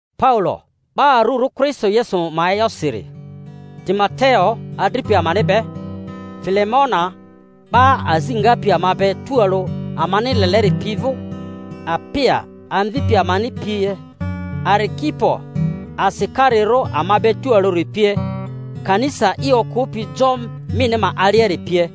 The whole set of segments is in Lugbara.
Paulo, 'ba arurᴜ Kristo Yesu ma e'yosiri, Timoteo adripi amani be, Filemona 'ba azi ngapi ama be tualᴜ amani leleri pi vᴜ Apia amvipi amani pie, Arikipo asikarirᴜ ama be tualᴜri pie, kanisa i okᴜpi jo mini ma aliari pie: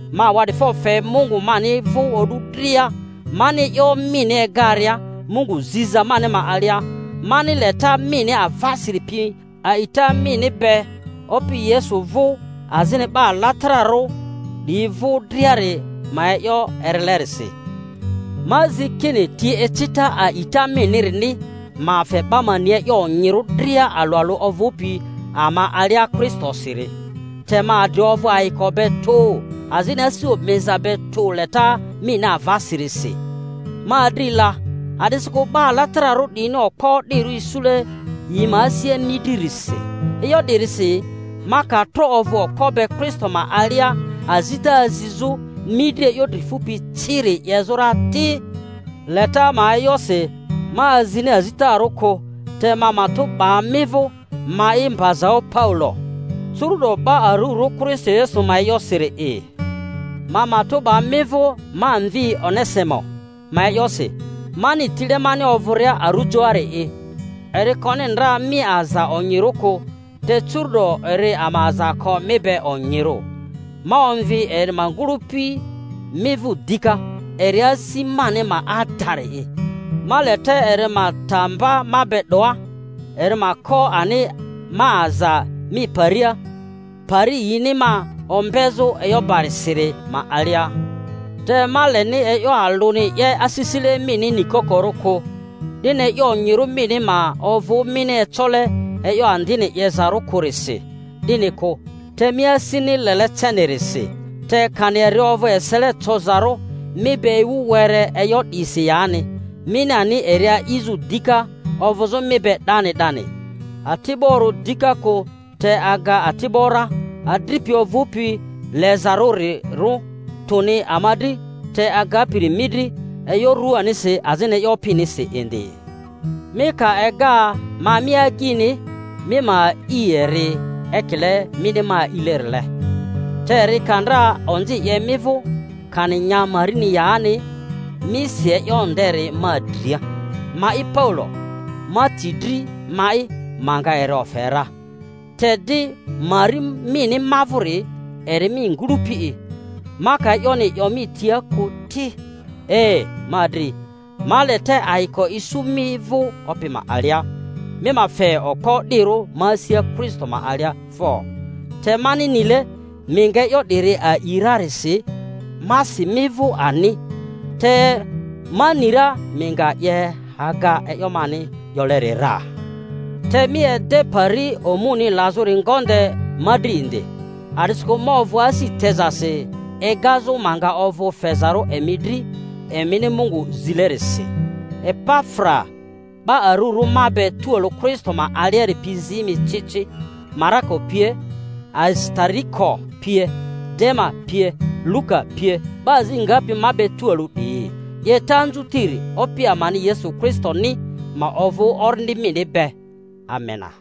Ma awa'difo fe Mungu mani vᴜ o'du dria, mani e'yo mini egaria Mungu ziza mani ma alia, mani leta mini avasiri pi, a'ita mini be Opi Yesu vᴜ azini 'ba alatararᴜ 'diyi vᴜ driari ma e'yo erilerisi; ma zi kini ti ecita a'ita minirini ma fe 'ba ma ni e'yo onyirᴜ dria alᴜ alᴜ ovᴜpi ama alia Kristosiri. Te ma adri ovᴜ ayiko be tᴜ azini asi omiza be tᴜ leta mini avasirisi, ma adri la, a'disikᴜ 'ba alatararᴜ 'diyini okpo o'dirᴜ isule yi ma asia mi dririsi. E'yo 'dirisi, ma ka tro ovᴜ okpo be Kristo ma alia azita azizᴜ mi dri e'yo dri fupi ciri 'yezᴜ ra ti, leta ma e'yosi ma azini azitarᴜ kᴜ, te ma matᴜ 'ba mi vᴜ—ma'i mbazaᴜ Paulo, curu'do 'ba arurᴜ Kristo Yesu ma e'yosiri'i— ma matᴜ 'ba mi vᴜ ma mvi Onesimo ma e'yosi, mani tile mani ovᴜria arujoari'i. (Eri koni ndra mi aza onyirᴜ kᴜ, te curu'do eri ama aza ko mi be onyirᴜ.) Ma omvi eri ma ngᴜ-lᴜpi mi vᴜ dika, eri asi mani ma adari'i. Ma le te eri ma ta mba ma be 'doa, eri ma ko ani ma aza mi paria, pari yini ma ombezᴜ e'yo barisiri ma alia; te ma leni e'yo alᴜni 'ye asisile mini nikokorᴜ kᴜ, 'dini e'yo onyirᴜ mini ma ovᴜ mini ecole e'yo andini 'yezarᴜ kᴜrisi 'dini kᴜ, te mi asini lele cenirisi. Te kani eri ovᴜ esele cozarᴜ mi be ewu were e'yo 'disi yani, mini ani eri a'izᴜ dika ovᴜzᴜ mi be 'dani 'dani, ati'borᴜ dika kᴜ te aga ati'bo ra, adripi ovᴜpi lezarᴜrirᴜ, tᴜni ma dri, te agapiri mi dri, e'yo ruanisi azini e'yo Opinisi indi. Mi ka ega ma mi agyini, mi ma a'i eri ekile mini ma alilerile. Te eri ka ndra onzi 'ye mi vᴜ, kani nya marini yani, mi si e'yo nderi ma dria. Ma'i Paulo, ma ti dri ma'i ma nga eri ofe ra—te di mari mini ma vᴜri eri mi ngᴜlᴜpi'i, ma ka e'yoni 'yo mi tia kᴜ ti. E, ma adri, ma le te ayiko isu mi vᴜ Opi ma alia. Mi ma fe okpo o'dirᴜ ma asia Kristo ma alia fo. Te mani nile mi nga e'yo 'diri a'i rarisi, ma si mi vᴜ ani, te ma ni ra mi nga 'ye aga e'yo mani 'yoleri ra. Te mi ede pari omuni lazᴜri ngonde ma dri indi, a'disikᴜ ma ovᴜ asi tezasi egazᴜ ma nga ovᴜ fezarᴜ emi dri, emini Mungu zilerisi. Epafra, 'ba arurᴜ ma be tualᴜ Kristo ma aliari pi zi mi ci ci, Marako pie, Arisitariko pie, Dema pie, Luka pie, 'ba azi ngapi ma be tualᴜ 'diyi. 'Yeta anzutiri Opi amani Yesu Kristoni ma ovᴜ orindi mini be. Amena.